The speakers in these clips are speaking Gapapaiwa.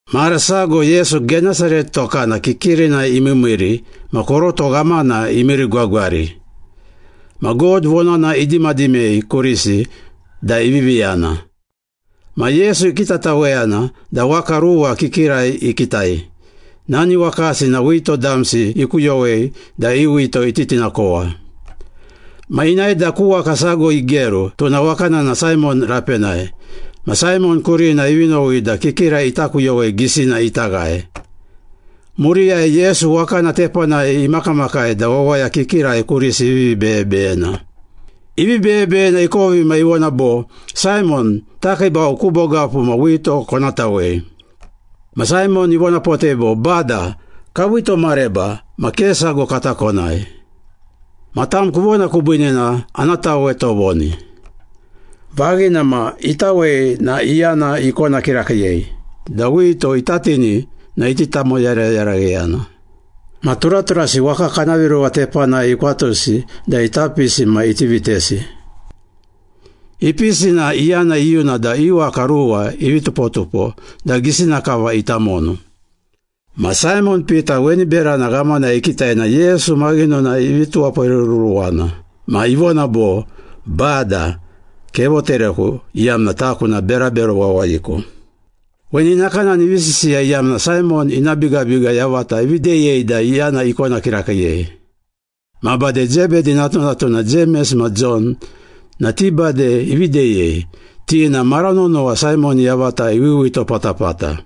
Mara sago Yesu, Genesaret tokana kikirinai imiimiiri ma koroto ghamana imiirigwagwari. Ma God vonana idimadimei kurisi da ivivi yana. Ma Yesu ikitataweyana da waka ruwa kikirai ikitai, nani wakasi na wito damsi ikuyowei da i wito ititinakowa. Ma inae da ku waka sago igeru, tuna wakana na Saimon rapenai. Ma Saimon kurina ivi nowi da kikira ita kuyowei gisina ita ghae. Muriyai Yesu wakana tepanai imakamakai da wawaya kikirai kurisi ivivi beyebeyena. Ivi beyebeyena ikovi na ivona bo, “Saimon, takiibau ku bogapu ma wito kona tawei.” Ma Saimon ivonapotei bo, “Bada, kawito mareba ma ke sago kata konai. Ma tam kuvona kubiine na ana tawe tovoni.” Vaghina ma, itawei na iyana ikona kirakiiyei da wito ita tini na iti tamoyarayaragheyana. Ma turaturasi waka kana viruwa tepanai ikwatusi da ita pisi ma iti vitesi. Ipisi na iyana iyuna da i waka ruwa ivi tupotupo da gisina kava ita monu. Ma Saimon Pita weni berana ghamana ikitai na Yesu maghinonai ivi tuwaporeruruwana. Ma ivona bo, “Bada, kevotereku, iyamna taku na berabero wawayiku!” Weni nakanani ivi sisiya iyamna Saimon ina bigabiga yavata ivi deyei da iyana ikona kirakiiyei. Ma bade Zebedi natunatuna Jemes ma Jon na ti bade ivi deyei, ti na mara nonowa Saimon yavata iwiwito patapata.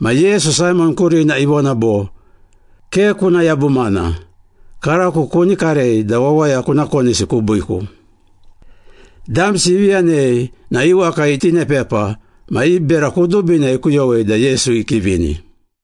Ma Yesu, Saimon kurina ivona bo, “Ke kuna yabumana. Karako kuni karei da wawaya kuna konisi kubiiku.” Damsi ivi yanei na i waka itinepepa ma i bera kudubina ikuyowei da Yesu ikivini.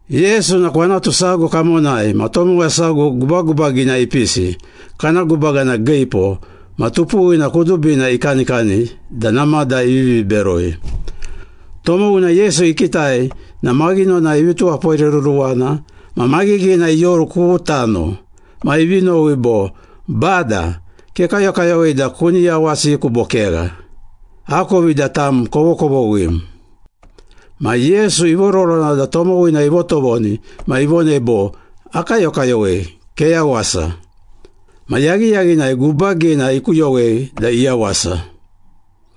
Yesu na kwanatu sago kamonai ma tomowa sago gubagubagina ipisi, kana gubaga na giipo ma tupuwina kudubina ikanikani da namada ivivi beroi. Tomowina Yesu ikitai na maghinonai ivi tuwaporeruruwana ma maghighina ioru ku tano. Ma ivi nowi bo, “Bada, kekayokayowei da kuni yawasiku bo kegha? Akovi da tam kovokovoghim.” Ma Yesu ivororona da tomowina ivotovoni ma ivonei bo, “Akayokayowei. Keyawasa.” Ma yaghiyaghinai gubagina ikuyowei da iyawasa.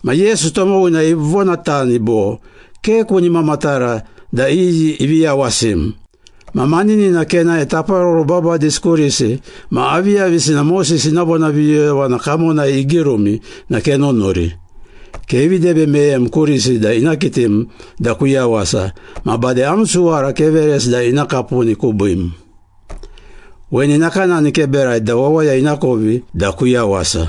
Ma Yesu tomowina ivonatani bo, “Ke kuni mamatara da iyi ivi yawasim. Ma maninina kenae taparoro babadisi kurisi ma aviyavisina Moses ina vonaviyoyovana kamonai igirumi na kenunuri. Kevi debe meyem kurisi da ina kitim da kuyawasa ma bade am suwara keveresi da ina kapuni kubiim. Weni nakanani keberai da wawaya inakovi da kuyawasa.”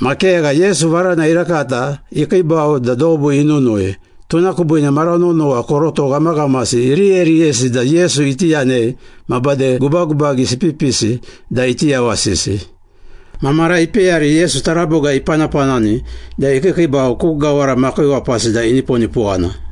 Ma kegha, Yesu varana irakata ikiibau da dobu inunui. Tuna kubiine mara nonowa koroto ghamaghamasi iriyeriyesi da Yesu iti yanei ma bade gubagubagisi ipipisi da iti yawasisi. Ma mara ipeyari Yesu taraboga ipanapanani da ikiikiibau ku gawara makiiwapasi da iniponipowana.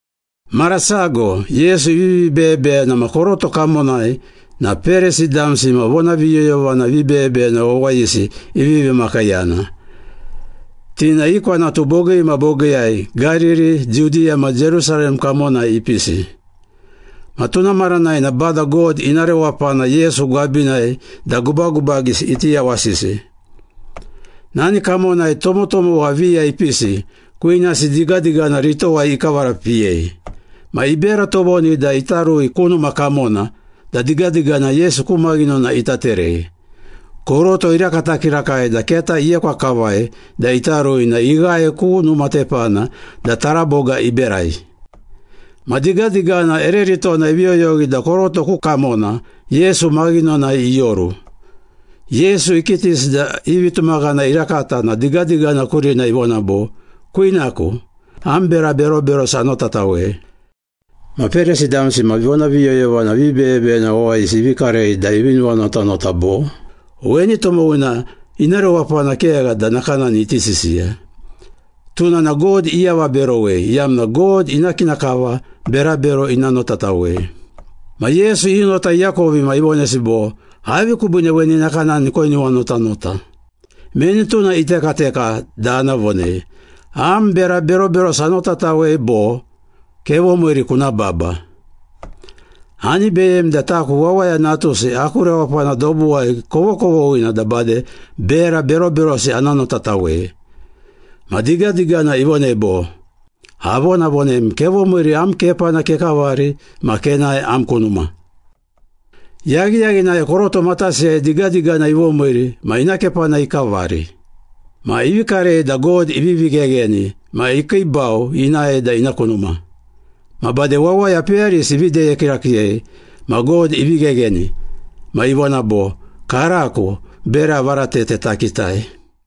Mara sago Yesu ivivi beyebeyena ma koroto kamonai na Perisi damsi ma vonaviyoyovana vibeyebeyena wawayisi ivivi makiiyana. Ti na i kwanatu bogii ma bogiiyai Gariri, Judiya ma Jerusalem kamonai ipisi. Ma tuna maranai na Bada God ina rewapana Yesu gwabinai da gubagubagisi iti yawasisi. Nani kamonai tomotomowa viya ipisi, kwinasi digadigana ritowai ikavarapiyei. Ma ibera tovoni da ita rui ku numa kamona da digadigana Yesu ku maghinona ita terei. Koroto irakata kirakai da keta iekwa kavai da ita rui na ighae ku numa tepana da taraboga iberai. Ma digadigana ere ritona ivi yoyowi da koroto ku kamona Yesu maghinonai ioru. Yesu ikitisi da i vitumaghana irakata na digadigana kurina ivona bo, “Kwinaku, am bera beroberosi anotatawei.” Ma Perisi damsi ma vonaviyoyovana vibeyebeyena wawayisi ivi karei da ivi nuwanotanota bo, “Weni tomowina ina rewapana kegha da nakanani iti sisiya. Tuna na God iavaberowei iyamna God ina kina kava berabero ina notatawei.” Ma Yesu i nota iakovi ma ivonesi bo, “Avi kubiine weni nakanani koinuwanotanota? Meni tuna itekateka da ana vonei, ‘Am bera beroberosi anotatawei,’ bo ‘Kevomiiri, kuna baba.’ Ani beyemi da taku Wawaya Natusi aku rewapana dobuwai kovokovoghina da bade bera beroberosi ana notatawei.” Ma digadigana ivonei bo, “Avonavonem. Kevomiiri, am kepana kekavari ma kenae am ku numa.” Yaghiyaghinai koroto matasiyai digadigana ivomiiri ma ina kepana ikavari. Ma ivi karei da God ivivi ghegheni ma ikiibau inae da ina ku numa. Ma bade wawaya peyarisi ivi deye kirakiiyei ma God ivi ghegheni. Ma ivona bo, “Karako bera varatete takitai.”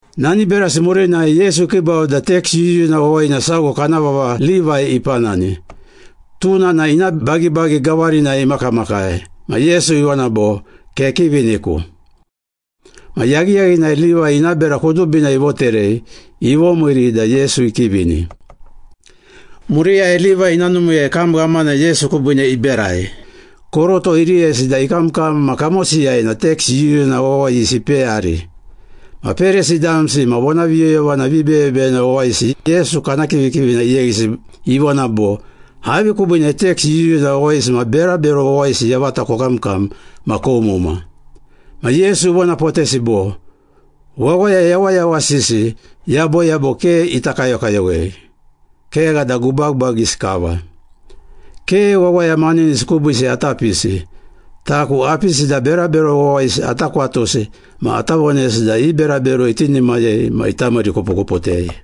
Nani berasi murinai Yesu ikiibau da teks yuyuna wawayina sago kana vava Livai ipanani, tuna na ina bagibagi gawarinai imakamakai. Ma Yesu ivona bo, “Kekiviniku.” Ma yaghiyaghinai Livai ina bera kudubina ivoterei, ivomiiri da Yesu ikivini. Muriyai Livai ina numiiyai kam ghamana Yesu kubiine iberai. Koroto iriyesi da ikamkam ma kamosiyai na teks yuyuna wawayisi ipeyari. Ma Perisi damsi ma vonaviyoyovana vibeyebeyena wawayisi Yesu kana kivikivina iyeghisi, ivona bo, “Avi kubiine teks yuyuna wawayisi ma berabero wawayisi yavata kokamkam ma koumuma?” Ma Yesu ivonapotesi bo, “Wawaya yawayawasisi yaboyabo ke ita kayokayowei, kegha da gubagubagisi kava. Ke wawaya maninisi kubiisi ata pisi. Taku apisi da berabero wawayisi ata kwatusi ma ata vonesi da i berabero itinimayei ma ita miirikupukuputei.”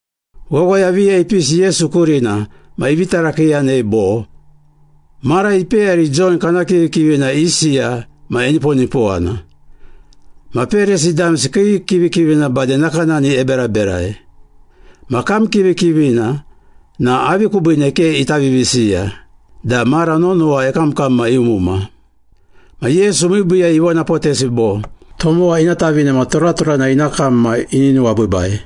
Wawaya viya ipisi Yesu kurina ma ivi tarakiiyanei bo, “Mara ipeyari Jon kana kivikivina isiya ma eniponipowana. Ma Perisi damsi kii kivikivina bade nakanani eberaberai. Ma kam kivikivina na avi kubiine ke ita vivisiya da mara nonowa ekamkam ma eumuma?” Ma Yesu miibiiyai ivonapotesi bo, “Tomowa ina tavine na turaturana ina kam ma ini nuwabiibai.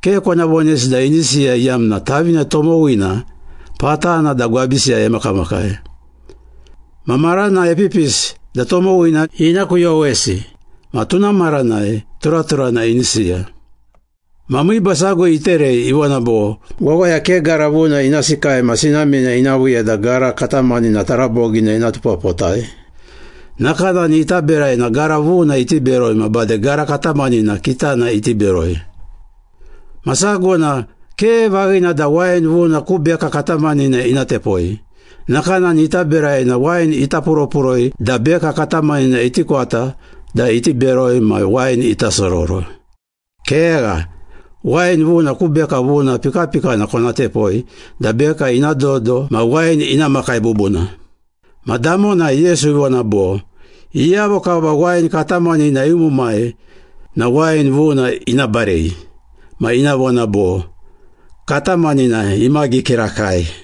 Ke kona vonesi da ini siya iyamna tavine tomowina patana da gwabisiyai emakamakai. Ma marana epipisi da tomowina ina kuyowesi, ma tuna maranai turaturana ini siya.” Ma miiba sago iterei, ivona bo, “Wawaya ke gara vuna ina sikai ma sinamina ina viiya da gara katamanina tarabogina ina tupapotai. Nakanani ita berai na gara vuna iti beroi ma bade gara katamanina kitana iti beroi.” “Ma sago na ke vaghina da wain vuna ku beka katamanina ina tepoi. Nakanani ita berai na wain ita puropuroi da beka katamanina iti kwata da iti beroi ma wain ita sororo. Kegha, wain vuna ku beka vuna pikapikana kona tepoi da beka ina dodo ma wain ina makai bubuna.” Ma damonai Yesu ivona bo, “Iyavo kava wain katamanina iumumai na wain vuna ina barei ma ina vona bo, ‘Katamanina imagi kirakai.’”